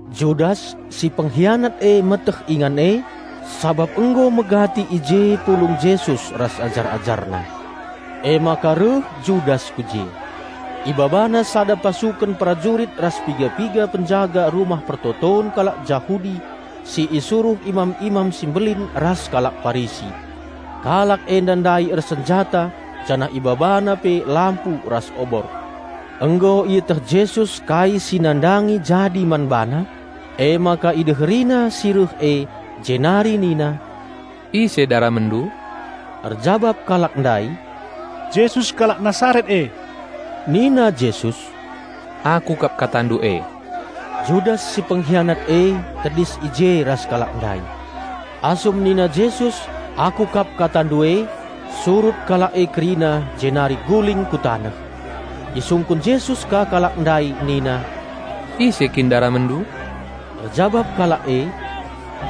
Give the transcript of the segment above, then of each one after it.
Judas, si penghianat e meteh ingan e, sabap nggo megati i je pulung Jesus ras ajar-AjarNa. Emaka reh Judas ku je. Ibabana sada pasuken perajurit ras piga-piga penjaga Rumah Pertoton kalak Jahudi si isuruh imam-imam si mbelin ras kalak Parisi. Kalak enda ndai ersenjata janah ibabana pe lampu ras obor. Nggo ieteh Jesus kai si nandangi jadi man BaNa; emaka ideherina si reh e, jenari Nina, "Ise daramenndu?" Erjabap kalak ndai, "Jesus kalak Nasaret e." Nina Jesus, "Aku kap katandu e." Judas si penghianat e tedis i je ras kalak ndai. Asum nina Jesus, "Aku kap katandu e," surut kalak e kerina jenari guling ku taneh. Isungkun Jesus ka kalak ndai nina, "Ise kin daramenndu?" Erjabap kalak e,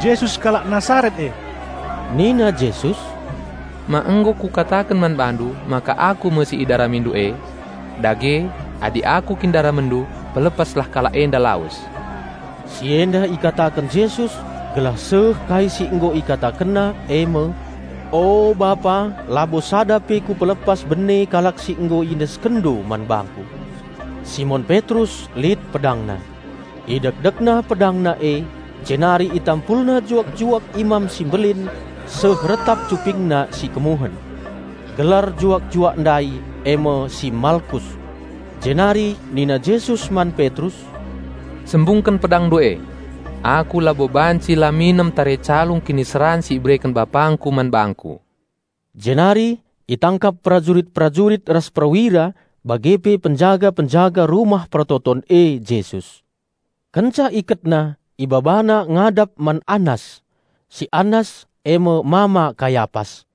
"Jesus kalak Nasaret e." Nina Jesus, "Ma nggo Kukataken man bandu maka Aku me si idaramindu e? Dage adi Aku kin daramenndu, pelepaslah kalak enda lawes." (Si enda ikataken Jesus gelah seh kai si nggo IkatakenNa, e me, "O Bapa labo sada pe Kupelepas bene kalak si nggo IendeskenNdu man bangKu.") Simon Petrus lit pedangna. Idekdekna pedangna e jenari itampulna juak-juak Imam si Mbelin seh retap cupingna si kemuhen. Gelar juak-juak ndai e me si Malkus. Jenari nina Jesus man Petrus, "Sembungken pedangndu e! Aku labo banci la minem tare calung kiniseran si ibereken BapangKu man bangKu." Jenari itangkap perajurit-perajurit ras perwira bage pe penjaga-penjaga Rumah Pertoton e Jesus. Kenca iketna ibabana ngadap man Annas. Si Annas, e me mama Kayapas.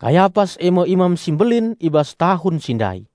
Kayapas e me Imam si Mbelin i bas tahun si ndai.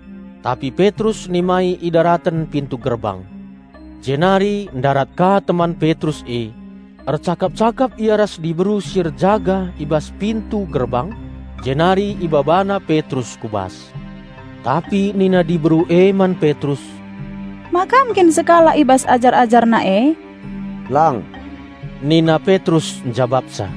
Tapi Petrus nimai i daraten pintu gerbang. Jenari ndarat ka teman Petrus e. Ercakap-cakap ia ras diberu si erjaga i bas pintu gerbang, jenari ibabana Petrus ku bas. Tapi nina diberu e man Petrus, "Ma kam kin sekalak i bas ajar-AjarNa e?" "Lang," nina Petrus njabapsa.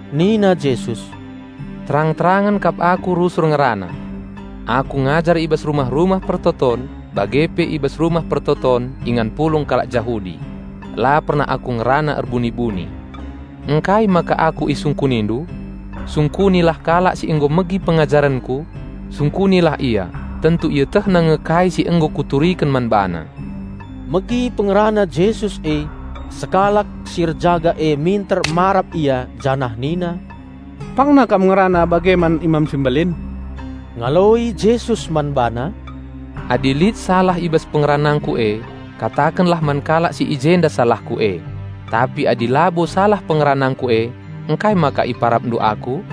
Nina Jesus, "Terang-terangen kap Aku rusur ngerana. Aku ngajar i bas rumah-rumah persembahen bage pe i bas Rumah Pertoton ingan pulung kalak Jahudi. La pernah Aku ngerana erbuni-buni. Ngkai maka Aku isungkunindu? Sungkunilah kalak si nggo megi pengajarenKu. Sungkunilah ia, tentu ietehna nge kai si nggo Kuturiken man bana." Megi pengerana Jesus e, sekalak si erjaga e minter marap Ia janah nina, "Pangna kam ngerana bage man Imam si Mbelin!" Ngaloi Jesus man bana, "Adi lit salah i bas pengeranangKu e, katakenlah man kalak si i jenda salahKu e. Tapi adi labo salah pengeranangKu e, ngkai maka iparapndu Aku?"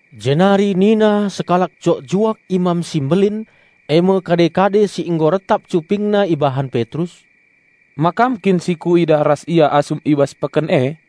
Jenari nina sekalak juak-juak Imam si Mbelin, e me kade-kade si nggo retap cupingna ibahan Petrus, "Ma kam kin si kuidah ras Ia asum i bas peken e?"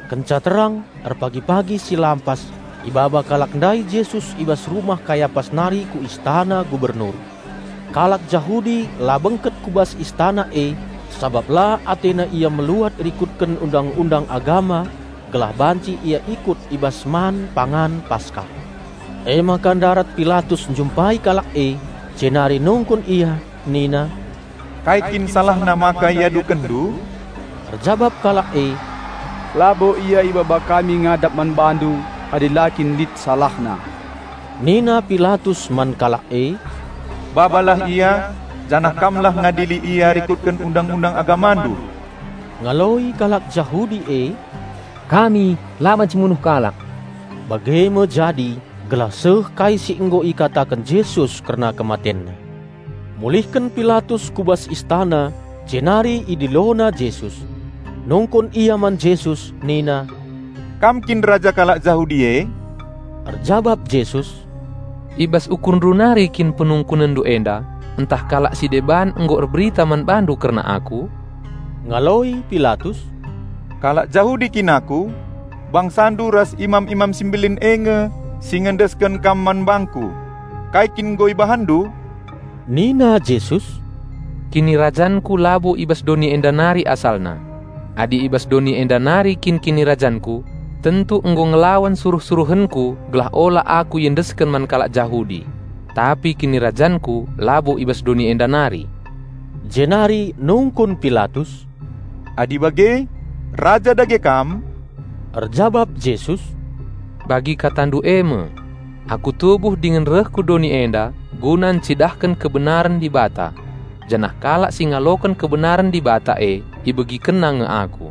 Kenca terang, erpagi-pagi si lampas ibaba kalak ndai Jesus i bas rumah Kayapas nari ku istana Gubernur. Kalak Jahudi la bengket ku bas istana e sabap la atena ia meluat rikutken Undang-undang agama gelah banci ia ikut i bas man pangan Paskah. Emaka ndarat Pilatus njumpai kalak e, jenari nungkun ia, nina, "Kai kin SalahNa maka iadukenndu?" Erjabap kalak e, "Labo Ia ibaba kami ngadap man bandu adi la kin lit SalahNa." Nina Pilatus man kalak e, "Babalah Ia, janah kamlah ngadili Ia rikutken Undang-undang agamandu!" Ngaloi kalak Jahudi e, "Kami la banci munuh kalak." (Bage me jadi gelah seh kai si nggo ikataken Jesus kerna KematenNa.) Mulihken Pilatus ku bas istana jenari idilona Jesus. Nungkun ia man Jesus nina, "Kam kin raja kalak Jahudi e?" Erjabap Jesus, "I bas ukurndu nari kin penungkunenndu enda ntah kalak si deban nggo erberita man bandu kerna Aku?" Ngaloi Pilatus, "Kalak Jahudi kin aku? BangsaNdu ras imam-imam simbelin e nge si ngendesken Kam man bangku. Kai kin nggo IbahanNdu?" Nina Jesus, "KinirajanKu labo i bas doni enda nari asalna. Adi i bas doni enda nari kin KinirajanKu tentu nggo ngelawan suruh-suruhenKu gelah ola Aku iendesken man kalak Jahudi. Tapi KinirajanKu labo i bas doni enda nari!" Jenari nungkun Pilatus, "Adi bage, raja dage kam?" Erjabap Jesus, "Bagi katandu e me. Aku tubuh dingen reh ku doni enda, guna encidahken kebenaren Dibata. Janah kalak si ngaloken kebenaren Dibata e ibegikenna nge Aku."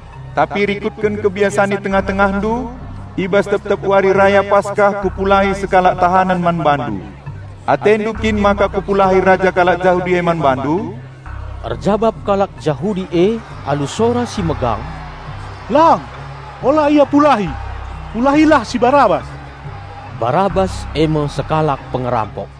Tapi rikutken kebiasan i tengah-tengahndu, i bas tep-tep Wari Raya Paskah kupulahi sekalak tahanen man bandu. Atendu kin maka kupulahi Raja kalak Jahudi e man bandu?" Erjabap kalak Jahudi e alu sora si megang, "Lang! Ola Ia pulahi. Pulahilah si Barabas!" (Barabas e me sekalak pengerampok.)